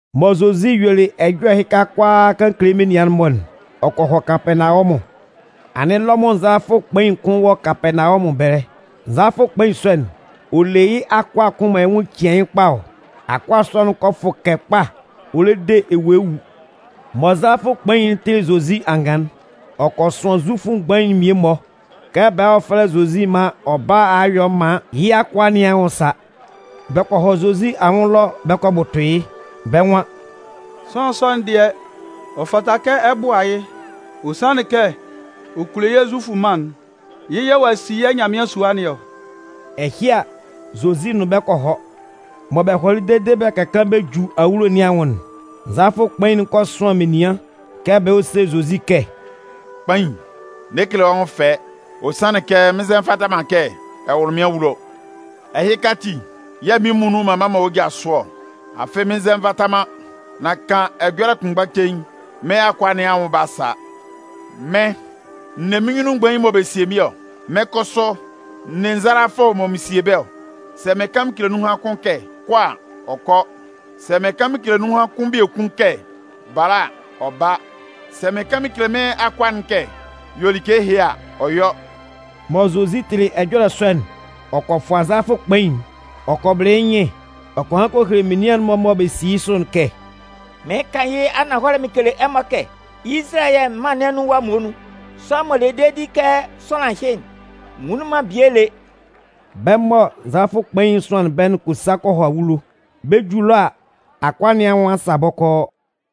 Mɔ Zozi yuelɩ ɛjɔlɛ ɛhɩka kʋalaa kan kele menian'n-mɔ, ɔ kɔ hɔ Kapɛɛnawɔmʋn. Anɩn Lɔmʋn nzalafʋ kpain'n kʋn wɔ Kapɛɛnawɔmʋn ɛbɛlɛ. Nzalafʋ kpain sɔ'n, ɔ le yɩ́ akʋa kʋn mɔ yɩ́ nwʋn cian yɩ́ kpa ɔ. Akʋa sɔ'n kɔ fʋkɛ kpa ɔ le de ewue wu. Mɔ nzalafʋ kpain'n tɩlɩ Zozi angan'n, ɔ kɔ sʋan zufʋ mgbain'n mmie-mɔ kɛ bɛ hɔ́ fɛ́lɛ Zozi maan ɔ bála a yɔ maan yɩ́ akʋa nɩn anwʋn sa. Bɛ kɔ hɔ Zozi anwʋn ɛlɔ bɛ kɔ bʋtʋ yɩ́. Bɛ́ nwan: “Sʋanlan sɔ'n dɩɛ, ɔ fata kɛ ɛ bʋa yɩ́. Ɔ sanlɩn kɛ ɔ kulo yɛ́ Zufʋ mân'n. Yɩ́ yɛ̂ ɔ'a si yɛ́ Nyanmɩan sua nɩn ɔ.” Ɛhɩ a, Zozi nʋn bɛ́ bɛ kɔ hɔ. Mɔ bɛ hɔlɩ dede bɛ ka kaan bɛ ju awulo nɩn anwʋn'n, nzalafʋ kpain'n kɔ sʋan menian kɛ bɛ hɔ́ sé Zozi kɛ: “Kpain, n'ɛ kele wɔ́ nwʋn ɛfɛ. Ɔ sanlɩn kɛ mɩn nzɛ nvata man kɛ ɛ wʋ́lʋ mɩn awulo. Ɛhɩka ati yɛ̂ mɩ́n muonun m'an mma man wɔ́ ja sʋ ɔ, afɩ mɩn nzɛ nvata man. Nan kan ɛjɔlɛ kpɔlɛ kʋnmgba cein, mɩ́n akʋa nɩn anwʋn 'ba sa. Mɩ́n, n ne mɩ́n nyunnun mgbain mɔ bɛ sie mɩ́n ɔ. Mɩ́n kʋsʋ, n ne nzalafʋ mɔ mɩn sie bɛ́ ɔ. Sɛ mɩn kan mɩn kele nunhan kʋn kɛ: ‘Kɔ!’ a, ɔ kɔ. Sɛ mɩn kan mɩn kele nunhan kʋn biekun kɛ: ‘Bala!’ a, ɔ ba. Sɛ mɩn kan mɩn kele mɩ́n akʋa'n kɛ: ‘Yɔ like ɛhɩ’ a, ɔ yɔ.” Mɔ Zozi tɩlɩ ɛjɔlɛ sɔ'n, ɔ kɔ fʋa nzalafʋ kpain'n. Ɔ kɔ bɩlɩ yɩ́ nyɩn ɔ kɔ han kɔ hele menian'n-mɔ mɔ bɛ si yɩ́ sʋ'n kɛ: “Mɩɩn kan yɩ́ ananhɔlɛ mɩn kele ɛmɔ: Izalayɛ mân nɩn anun ɛwa muonun, sʋanlan m'ɔ le dedi kɛ sʋanlan ɛhɩ'n, n nwunlin man bie lé.” Bɛ́ mɔ nzalafʋ kpain'n sʋanlɩn bɛ́'n kɔ sa kɔ hɔ awulo. Bɛ 'ju ɛlɔ a, akʋa nɩn anwʋn a sa bɔkɔɔ.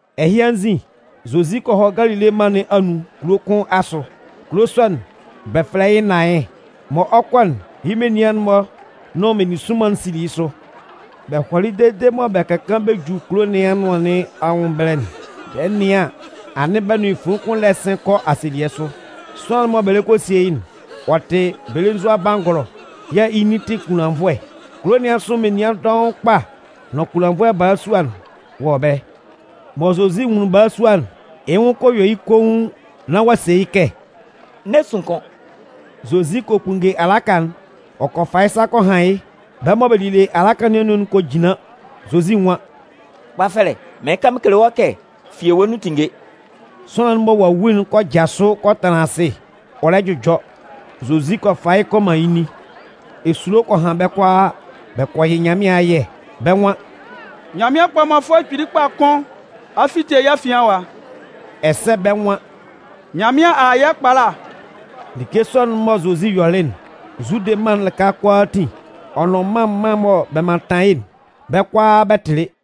Ɛhɩ anzin, Zozi kɔ hɔ Galile mân nɩn anun kulo kʋn asʋ. Kulo sɔ'n, bɛ fɛlɛ yɩ́ Naɩn. Mɔ ɔ 'kɔ'n, yɩ́ menian'n-mɔ nʋn meninsʋnman sili yɩ́ sʋ. Bɛ hɔlɩ dede mɔ bɛ ka kaan bɛ ju kulo nɩn anʋan nɩn anwʋn ɛbɛlɛ'n, bɛ 'nɩan an, anɩn bɛ nʋn fuin kʋn lɛ sɩn kɔ asielɩɛ sʋ. Sʋanlan'n mɔ bɛ lɛ kɔ a sie yɩ́'n, ɔ tɩ belenzua bangɔlɔ yɛ̂ yɩ́ nin tɩ kunlannvʋɛ. Kulo nɩn asʋ menian dɔʋn kpa nʋn kunlannvʋɛ balasua'n wɔ ɛbɛlɛ. Mɔ Zozi nwunlin balasua'n, yɩ́ nwʋn kɔ yɛ yɩ́ koun nán ɔ a se yɩ́ kɛ: “N'ɛ sun kʋ́n!” Zozi kɔ kpunnge alaka'n, ɔ kɔ fa yɩ́ sa kɔ han yɩ́. Bɛ́ mɔ bɛ lile alaka nɩn anun'n kɔ jinlan, Zozi nwan: “Kpafɛlɛ, mɩɩn kan mɩn kele wɔ́, fi ewue nun tínnge!” Sʋanlan'n mɔ ɔ'a wu'n kɔ jasʋ kɔ tanlan asɩ ɔ lɛ jʋjɔ. Zozi kɔ fa yɩ́ kɔ man yɩ́ nin. Esulo kɔ han bɛ́ kʋalaa, bɛ kɔ yɩ Nyanmɩan ayɛ. Bɛ́ nwan: “Nyanmɩan kpɔmanfʋɛ kpili kpa kʋn a fite yɛ́ afian ɛwa!” Ɛsɛ bɛ́ nwan: “Nyanmɩan a a yɛ́ ɛkpala.” Like sɔ'n mɔ Zozi yɔlɩ'n, Zude mân'n lɩka kʋalaatin, ɔ nʋn mân mân mɔ bɛ mantan yɩ́'n, bɛ́ kʋalaa bɛ tɩlɩ.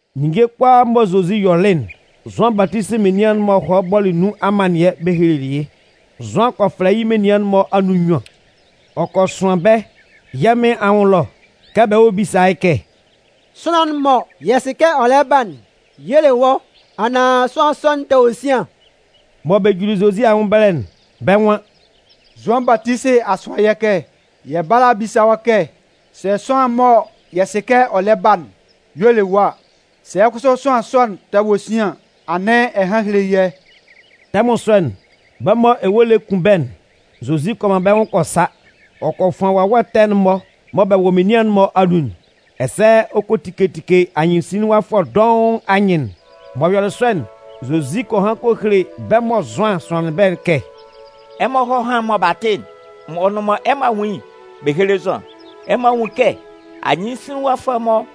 Ninnge kʋalaa mɔ Zozi yɔlɩ'n, Zʋan Batisi menian'n-mɔ hɔlɩ bɔlɩ nun amannɩɛ bɛ helelɩ yɩ́. Zʋan kɔ fɛlɛ yɩ́ menian'n-mɔ anun nnyuan ɔ kɔ sʋan bɛ́ yɛ́ Mɩn anwʋn ɛlɔ kɛ bɛ hɔ́ bísa yɩ́ kɛ: “Sʋanlan'n mɔ yɛ sɩ kɛ ɔ lɛ ba'n y'ɔ le wɔ́ anaan sʋanlan sɔ'n tɛ wɔ sian?” Mɔ bɛ juli Zozi anwʋn ɛbɛlɛ'n, bɛ́ nwan: “Zʋan Batisi a sʋan yɛ́ kɛ yɛ bála a bisa wɔ́ kɛ sɛ sʋanlan'n mɔ yɛ sɩ kɛ ɔ lɛ ba'n y'ɔ le wɔ́ a, sɛ kʋsʋ sʋanlan sɔ'n tɛ wɔ sian an, anɩn ɛ hán héle yɛ́.” Tɛmʋn sɔ'n, bɛ́ mɔ ewue lɛ kun bɛ́'n, Zozi kɔ man bɛ́ nwʋn kɔ sa. Ɔ kɔ fʋan wawɛ ɛtɛ'n-mɔ mɔ bɛ wɔ menian'n-mɔ anun'n, ɛsɛ ɔ kɔ tike tike anyɩnsinlinwafʋɛ dɔʋn anyɩn'n. M'ɔ yɔlɩ sɔ'n, Zozi kɔ han kɔ hele bɛ́ mɔ Zʋan sʋanlɩn bɛ́'n kɛ: “Ɛmɔ hɔ́ hán mɔ ɛmɔ a tɩ'n, ɔ nʋn mɔ ɛmɔ a nwun yɩ́'n bɛ héle Zʋan. Ɛmɔ a nwun kɛ anyɩnsinlinwafʋɛ'n-mɔ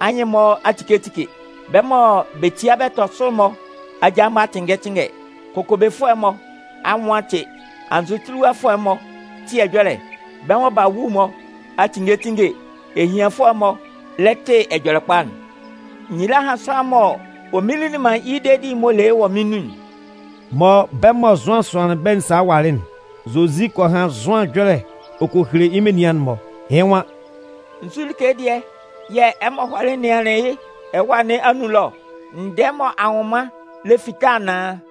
anyɩn'n-mɔ a tike tike, bɛ́ mɔ bɛ tia bɛ tɔ sʋ'n-mɔ aja'n-mɔ a tɩnngɛ tɩnngɛ, kokobefʋɛ'n-mɔ anwʋn a tɩ, anzʋtiliwafʋɛ'n-mɔ tɩ ɛjɔlɛ, bɛ́ mɔ b'a wu'n-mɔ a tinnge tinnge, ehianfʋɛ'n-mɔ lɛ tɩ Ɛjɔlɛkpa'n. Nyila hán sʋanlan mɔ ɔ mminlin man yɩ́ dedi'n m'ɔ le yɩ́ wɔ mɩ́n nun'n.” Mɔ bɛ́ mɔ Zʋan sʋanlɩn bɛ́'n salɩ hɔlɩ'n, Zozi kɔ han Zʋan ɛjɔlɛ ɔ kɔ hele menian'n-mɔ. Yɩ́ nwan: “Nzu like dɩɛ yɛ̂ ɛmɔ hɔlɩ nɩanlɩn yɩ́ ɛwâ nɩn anun ɛlɔ ɔ? Ndɛɛ mɔ anwʋnman lɛ fita anaan?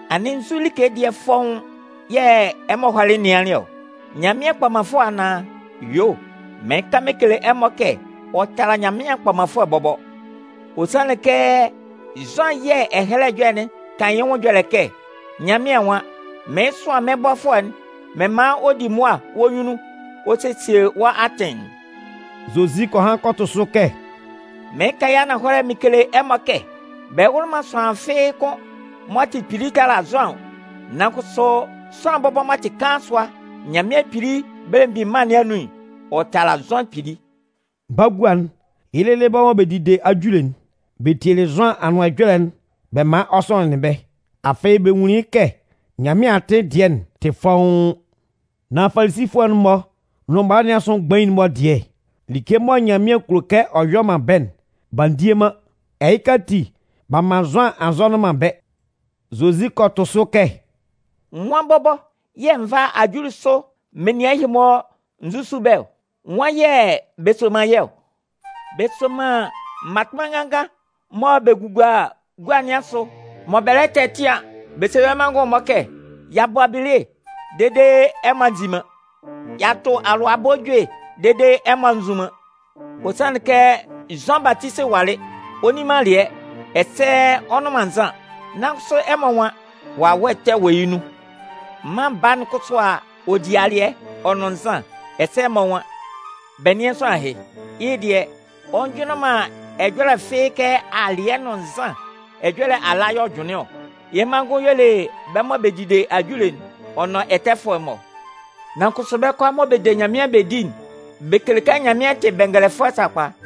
Anɩn nzu like dɩɛ fɔ́ʋ́n yɛ̂ ɛmɔ hɔlɩ nɩanlɩn ɔ? Nyanmɩan kpɔmanfʋɛ anaan? Yuo, mɩɩn kan mɩn kele ɛmɔ kɛ ɔ tala Nyanmɩan kpɔmanfʋɛ bɔbɔ. Ɔ sanlɩn kɛ Zʋan yɛ̂ Ɛhɛlɛ Ɛjɔlɛ'n kan yɩ́ ɛjɔlɛ kɛ: Nyanmɩan nwan: Mɩɩn sʋan mɩ́n bɔfʋɛ'n mɩn man ɔ di mʋa wɔ́ nyunnun ɔ sesie wɔ́ atɩn'n.” Zozi kɔ han kɔ tʋ sʋ kɛ: “Mɩɩn kan yɩ́ ananhɔlɛ mɩn kele ɛmɔ kɛ bɛ wʋlɩ man sʋanlan fɩ́ɩ́ kʋ́n m'ɔ tɩ kpili tala Zʋan ɔ. Nan kʋsʋ sʋanlan bɔbɔ m'ɔ tɩ kaan sʋa Nyanmɩan Belemgbin Mân nɩn anun'n, ɔ tala Zʋan kpili.” Bagua'n, yɩ́ lɩlɩ bɛ́ mɔ bɛ dide ajule'n, bɛ tielɩ Zʋan anʋan ɛjɔlɛ'n bɛ man ɔ sɔnɩnlɩn bɛ́. Afɩ bɛ nwunlin kɛ Nyanmɩan atɩn dɩɛ'n tɩ fɔ́ʋ́n. Nan Falisifʋɛ'n-mɔ nʋn mala nɩn asʋ mgbain'n-mɔ dɩɛ, like mɔ Nyanmɩan kulo kɛ ɔ yɔ man bɛ́'n, b'a ndie man. Ɛhɩ ati b'a man Zʋan a nzɔnɩn man bɛ́. Zozi kɔ tʋ sʋ kɛ: “Nwan bɔbɔ yɛ̂ n vá ajulisʋ menian ɛhɩ-mɔ n zusu bɛ́ ɔ? Nwan yɛ̂ bɛ soman yɩ́ ɔ? Bɛ soman mmatʋnman nganngan mɔ bɛ gugua gua nɩn asʋ, mɔ bɛ lɛ tɛtɩan bɛ se bɛ́ manngʋn'n-mɔ kɛ: ‘Y'a bɔ abile dede ɛmɔ a nzi man! Y'a tʋ alʋabɔ ejue dede ɛmɔ a nzun man!’ Ɔ sanlɩn kɛ Zʋan Batisi walɩ, ɔ nni man alɩɛ, ɛsɛ ɔ nnʋn man nzan, nan kʋsʋ ɛmɔ nwan: ‘Wawɛ ɛtɛ yɛ̂ ɔ wɔ yɩ́ nun ɔ!’ Mân Baa'n kʋsʋ a a, ɔ di alɩɛ, ɔ nʋn nzan, ɛsɛ ɛmɔ nwan: ‘Bɛ nɩ́an sʋanlan ɛhɩ, yɩ́ dɩɛ, ɔ njʋnlɩn ɛjɔlɛ fɩ́ɩ́ kɛ alɩɛ nʋn nzan ɛjɔlɛ ala yɛ̂ ɔ jʋnlɩn ɔ. Yɩ́ manngʋn y'ɔ le bɛ́ mɔ bɛ dide ajule'n ɔ nʋn ɛtɛfʋɛ'n-mɔ!’ Nan kʋsʋ bɛ́ kʋalaa mɔ bɛ de Nyanmɩan bɛ di'n, bɛ kele kɛ Nyanmɩan tɩ bɛngɛlɛfʋɛ sakpa.”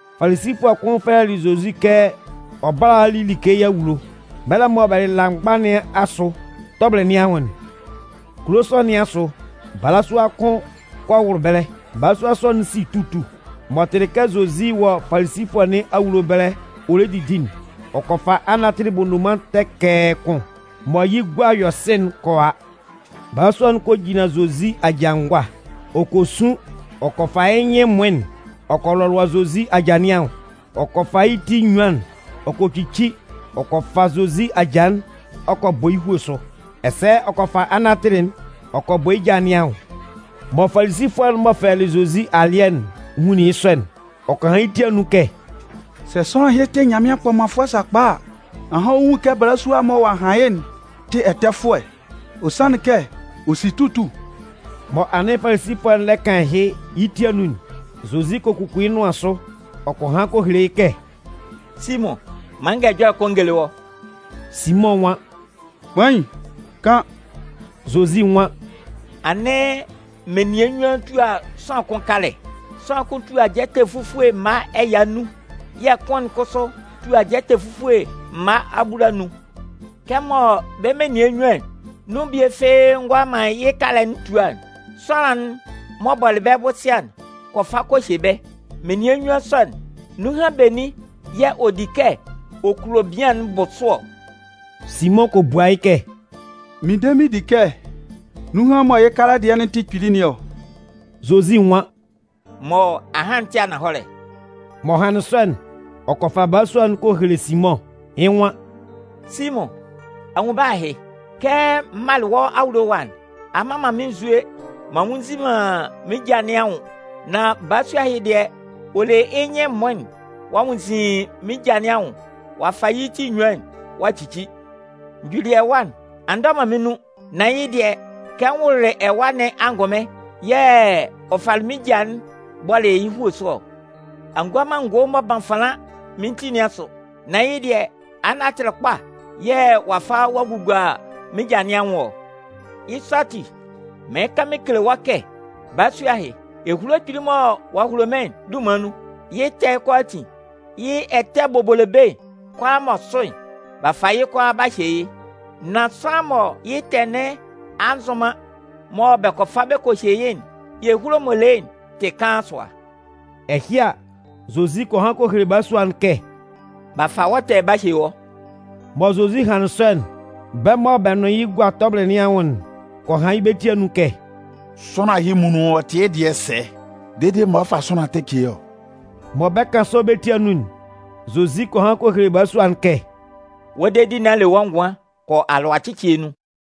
Falisifʋɛ kʋn fɛlɛlɩ Zozi kɛ ɔ bála a li like yɩ́ awulo. Mɛlɛ mɔ bɛ lɩla mgba nɩn asʋ tɔbɩlɩ nɩn anwʋn'n, kulo sɔ nɩn asʋ balasua kʋn kɔ wʋlʋ ɛbɛlɛ. Balasua sɔ'n si tutu. M'ɔ tɩlɩ kɛ Zozi wɔ Falisifʋɛ nɩn awulo ɛbɛlɛ ɔ lɛ didi'n, ɔ kɔ fa anatɩlɩ bondoman tɛkɛɛ kʋn mɔ yɩ́ gua yɔ sɩ'n kɔ a. Balasua'n kɔ jinlan Zozi aja ngʋa. Ɔ kɔ sun ɔ kɔ fa yɩ́ nyɩn ɛmʋɩn'n ɔ kɔ lɔlʋa Zozi aja nɩn anwʋn. Ɔ kɔ fa yɩ́ ti enyuan'n ɔ kɔ cici ɔ kɔ fa Zozi aja'n ɔ kɔ bɔ yɩ́ hue sʋ, ɛsɛ ɔ kɔ fa anatɩlɩ'n ɔ kɔ bɔ yɩ́ ja nɩn anwʋn. Mɔ Falisifʋɛ'n m'ɔ fɛlɛlɩ Zozi alɩɛ'n nwunlin yɩ́ sɔ'n, ɔ kɔ han yɩ́ ti anun kɛ: “Sɛ sʋanlan ɛhɩ tɩ Nyanmɩan kpɔmanfʋɛ sakpa a, ahan ɔ 'nwun kɛ balasua'n mɔ ɔ'a han yɩ́'n tɩ ɛtɛfʋɛ. Ɔ sanlɩn kɛ ɔ si tutu.” Mɔ anɩn Falisifʋɛ'n lɛ kan ɛhɩ yɩ́ ti anun'n, Zozi kɔ kuku yɩ́ nʋan sʋ ɔ kɔ han kɔ hele yɩ́ kɛ: “Simʋn, man n gán ɛjɔlɛ kʋn n géle wɔ́.” Simʋn nwan: “Kpain, kan.” Zozi nwan: “Anɩn menian nnyuan tua sʋanlan kʋn kalɛ. Nunhan kʋn tua jɛtɛ fufue mma ɛya nnun, yɛ̂ kʋn'n kʋsʋ tua jɛtɛ fufue mma abulanun. Kɛmɔ bɛ́ menian nnyuan'n nun bie fɩ́ɩ́ ngʋala man yɩ́ kalɛ'n tua'n, sʋanlan'n m'ɔ bɔlɩ bɛ bʋsɩa'n kɔ fa kɔ hye bɛ́. Menian nnyuan sɔ'n, nunhan benin yɛ̂ ɛ de di kɛ ɔ 'kulo bian'n bʋ sʋ ɔ?” Simʋn kɔ bua yɩ́ kɛ: “Mɩn de mɩn di kɛ nunhan mɔ yɩ́ kalɛ dɩɛ'n tɩ kpili nɩn ɔ.” Zozi nwan: “Mɔ a han'n tɩ ananhɔlɛ.” M'ɔ hanlɩn sɔ'n, ɔ kɔ fa balasua'n kɔ hele Simʋn, yɩ́ nwan: “Simʋn, a nwun balasua ɛhɩ? Kɛ m malɩ wɔ́ awulo ɛwa'n, a mman man mɩ́n nzue m'an nwunnzin man mɩ́n ja nɩn anwʋn. Nan balasua ɛhɩ dɩɛ, ɔ le yɩ́ nyɩn ɛmʋɩn'n ɔ'a nwunnzin mɩ́n ja nɩn anwʋn, ɔ'a fa yɩ́ ti enyuan'n ɔ'a cici. N juli ɛwa'n, a ndɔ man mɩ́n nun. Nan yɩ́ dɩɛ, kɛ n wʋlʋlɩ ɛwa nɩn angʋnmɩn yɛ̂ ɔ falɩ mɩ́n ja'n-mɔ bɔlɩ yɩ́ hue sʋ ɔ. A ngua man ngo m'ɔ ban fanlan mɩ́n ti nɩn asʋ. Nan yɩ́ dɩɛ, anatɩlɩ kpa yɛ̂ ɔ'a fa ɔ'a gugua mɩ́n ja nɩn anwʋn ɔ. Yɩ́ sɔ ati, mɩɩn kan mɩn kele wɔ́ kɛ balasua ɛhɩ, ehulo kpili'n mɔ ɔ'a hulo mɩ́n'n dunman nun, yɩ́ ɛtɛ'n kʋalaatin, yɩ́ ɛtɛ bobolobe'n kʋalaa m'ɔ sʋ'n, b'a fa yɩ́ kʋalaa b'a hye yɩ́. Nan sʋanlan mɔ yɩ́ ɛtɛ nɩn a nzʋn man mɔ bɛ kɔ fa bɛ kɔ hye yɩ́'n, ehulo'n m'ɔ le yɩ́'n tɩ kaan sʋa.” Ɛhɩ a, Zozi kɔ han kɔ hele balasua'n kɛ: “B'a fa wɔ́ ɛtɛ'n-mɔ b'a hye wɔ́.” Mɔ Zozi hanlɩn sɔ'n, bɛ́ mɔ bɛ́ nʋn yɩ́ gua tɔbɩlɩ nɩn anwʋn'n kɔ han yɩ́ bɛ́ ti anun kɛ: “Sʋanlan ɛhɩ muonun ɔ tɩ yɩ́ dɩɛ sɛ dede m'ɔ fa sʋanlan ɛtɛ ce yɩ́ ɔ?” Mɔ bɛ 'kan sɔ bɛ́ ti anun'n, Zozi kɔ han kɔ hele balasua'n kɛ: “Wɔ́ dedi nɩn a le wɔ́ ngʋan, kɔ alʋacɩcɩɛ nun.”